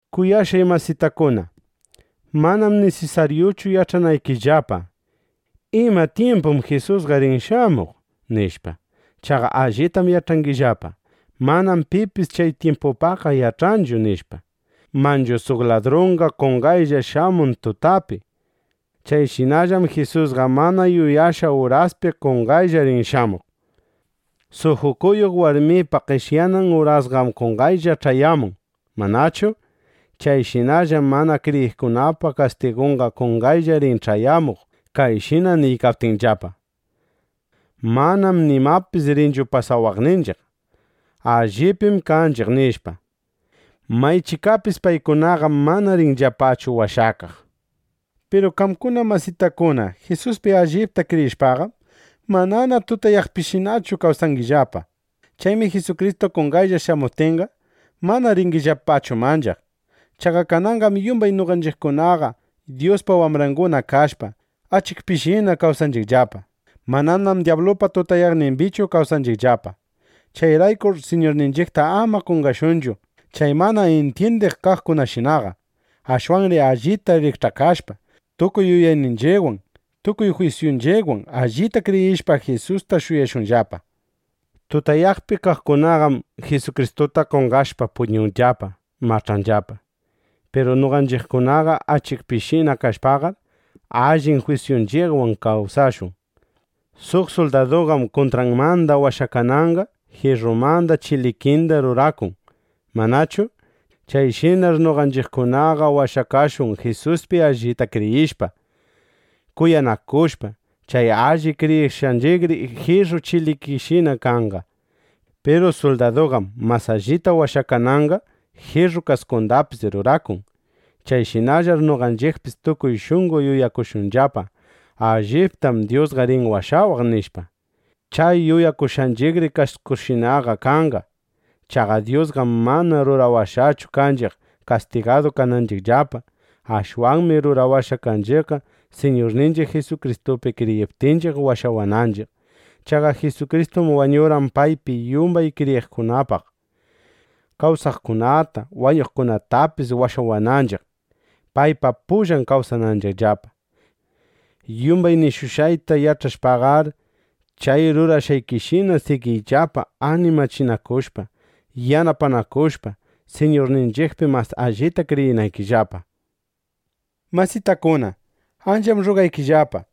Kuyashqay masitakuna, manam nisisaryuchu yach'ananchiqllapa: ¿Ima tyimpum Jisusqa rin shamuq? nishpa. Chaqa allitam yach'angillapa: Manam pipis chay tyimpupaqqa yach'anchu, nishpa. Manchu suq ladrunqa qonqaylla shamun tutapi. Chayshinallam Jisusqa mana yuyashqa uraspi qonqaylla rin shamuq. Suq ukuyuq (pach'ayuq) warmipa qeshyanan urasninqam qonqaylla ch'ayamun, ¿manachu? Chayshinallam mana kriyiqkunapa kastigunqa qonqaylla rin ch'ayamuq kayshina niykaptinllapa: “Manam nimapis rinchu pasawaqninchiq. Allipim kaykanchiq”, nishpa. ¡Maychikapis paykunaqam mana rinllapachu washakaq! Piru qamkuna masitakuna, Jisuspi allipta kriyishpaqam, manana tutayaqpishinachu kawsangillapa. Chaymi Jisukristu qonqaylla shamuptinqa, mana ringillapachu manchaq. Chaqa kananqam yumbay noqanchiqkunaqa Dyuspa wambranguna kashpa, achikpishinana kawsanchiqllapa. Mananam dyablupa tutayaqnimbichu kawsanchiqllapa. Chayraykur Siñurninchiqta ama qonqashunchu chay mana intyindiq kaqkunashinaqa. Ashwanri allita rikch'akashpa, tukuy yuyayninchiqwan, tukuy jwisyunchiqwan allita kriyishpa, Jisusta shuyashunllapa. Tutayaqpi kaqkunaqam (Jisukristuta qonqashpa) puñunllapa, mach'anllapa. Piru noqanchiqkunaqa achikpishina kashpaqar, allin jwisyunchiqwan kawsashun. Suq suldaduqam kuntranmanda washakananqa jirrumanda chilikinda rurakun, ¿manachu? Chayshinar noqanchiqkunaqa washakashun Jisuspi allita kriyishpa, kuyanakushpa. Chay alli kriyishqanchiqri jirru chilikinchiqshinaqa kanqa. Piru suldaduqam mas allita washakananqa jirru kaskundapis rurakun. Chayshinallar noqanchiqpis tukuy shunqo yuyakushunllapa: Alliptam Dyusqa rin washawaq, nishpa. Chay yuyakushqanchiqri kaskunchiqshinaqa kanqa. Chaqa Dyusqam mana rurawashqachu kanchiq, kastigadu kananchiqllapa. Ashwanmi rurawashqa kanchiqqa, Siñurninchiq Jisukristupi kriyiptinchiq washawananchiq. Chaqa Jisukristum wañurqan paypi yumbay kriyiqkunapaq, kawsaqkunata, wañuqkunatapis washawaqninchiq, paypa pullan kawsananchiqllapa. Yumbay nishushqayta yach'ashpaqar, chay rurashqaykishina sigiyllapa animachinakushpa yanapanakushpa, Siñurninchiqpi mas allita kriyinaykillapa. Masitakuna, ancham rrugaykillapa,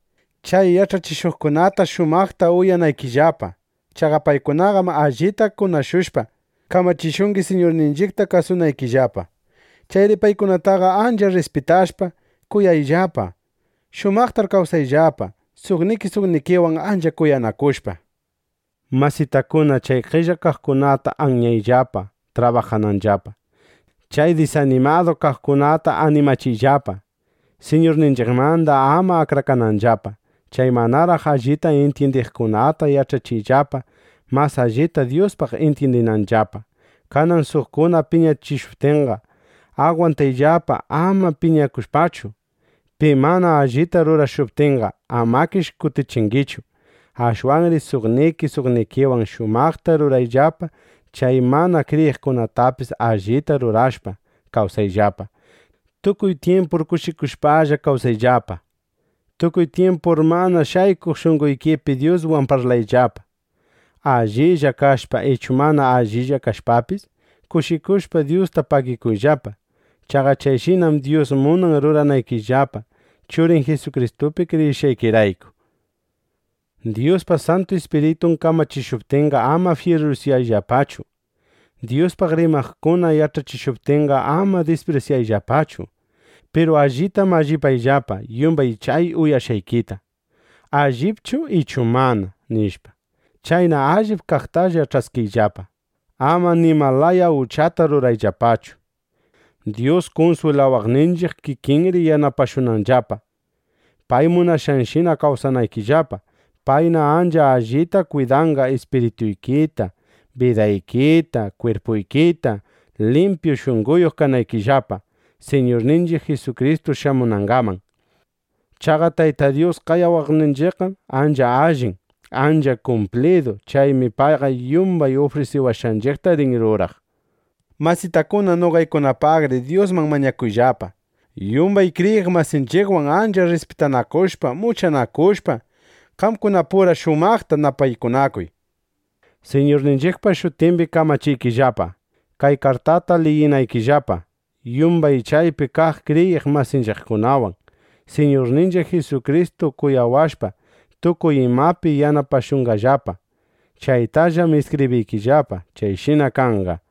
chay yach'achishuqkunata shumaqta uyanaykillapa. Chaqa paykunaqam allita kunashushpa, kamachishungi, Siñurninchiqta kasunaykillapa. Chayri paykunataqa ancha rrispitashpa, kuyayllapa. Shumaqtar kawsayllapa, suqniki suqnikiwan ancha kuyanakushpa. Masitakuna, chay qella kaqkunata anyayllapa trabajananllapa. Chay disanimadu kaqkunata animachiyllapa, Siñurninchiqmanda ama akrakananllapa. Chay manaraq allita intyindiqkunata yach'achiyllapa, mas allita Dyuspaq intyindinanllapa. Kanan suqkuna piñachishuptinqa agwantayllapa, ama piñakushpachu. Pi mana allita rurashuptinqa, amakish kutichingichu. Ashwanri suqniki suqnikiwan shumaqta rurayllapa. Chay mana kriyiqkunatapis allita rurashpa, kawsayllapa. Tukuy tyimpur kushikushpalla kawsayllapa. Tukuy tyimpur mana shaykuq shunqoykipi Dyuswan parlayllapa. Allilla kashpa ichu mana allilla kashpapis, kushikushpa Dyusta pagikuyllapa. Chaqa chayshinam Dyus munan ruranaykillapa, Churin Jisukristupi kriyishqaykirayku. Dyuspa Santu Ispiritun kamachishuptinqa, ama fyirusyayllapachu. Dyuspaq rimaqkuna yach'achishuptinqa, ama disprisyayllapachu. Piru allita mallipayllapa yumbay chay uyashqaykita: ¿Allipchu ichu mana? nishpa. Chayna allip kaqtalla ch'askiyllapa. Ama nima laya uchata rurayllapachu. Dyus kunswilawaqninchiq kikinri yanapashunqallapa, pay munashqanshina kawsanaykillapa. Payna ancha allita kwidanqa ispirituykita, bidaykita, kwirpuykita, limpyu shunqoyuq kanaykillapa, Siñurninchiq Jisukristu shamunangaman. Chaqa Tayta Dyus qayawaqninchiqqam ancha allin, ancha kumplidu. Chaymi payqa yumbay ufrisiwashqanchiqta rin ruraq. Masitakuna, noqaykunapaqri Dyusman mañakuyllapa. Yumbay kriyiq masinchiqwan ancha rrispitanakushpa muchanakushpa, qamkunapura shumaqta napaykunakuy. Siñurninchiqpa shutimbi kamachiykillapa, kay kartata liyinaykillapa yumbay chaypi kaq kriyiq masinchiqkunawan. Siñurninchiq Jisukristu kuyashushpa, tukuy imapi yanapashunqallapa. (Chaytallam iskibriykillapa.) Chayshina kanqa.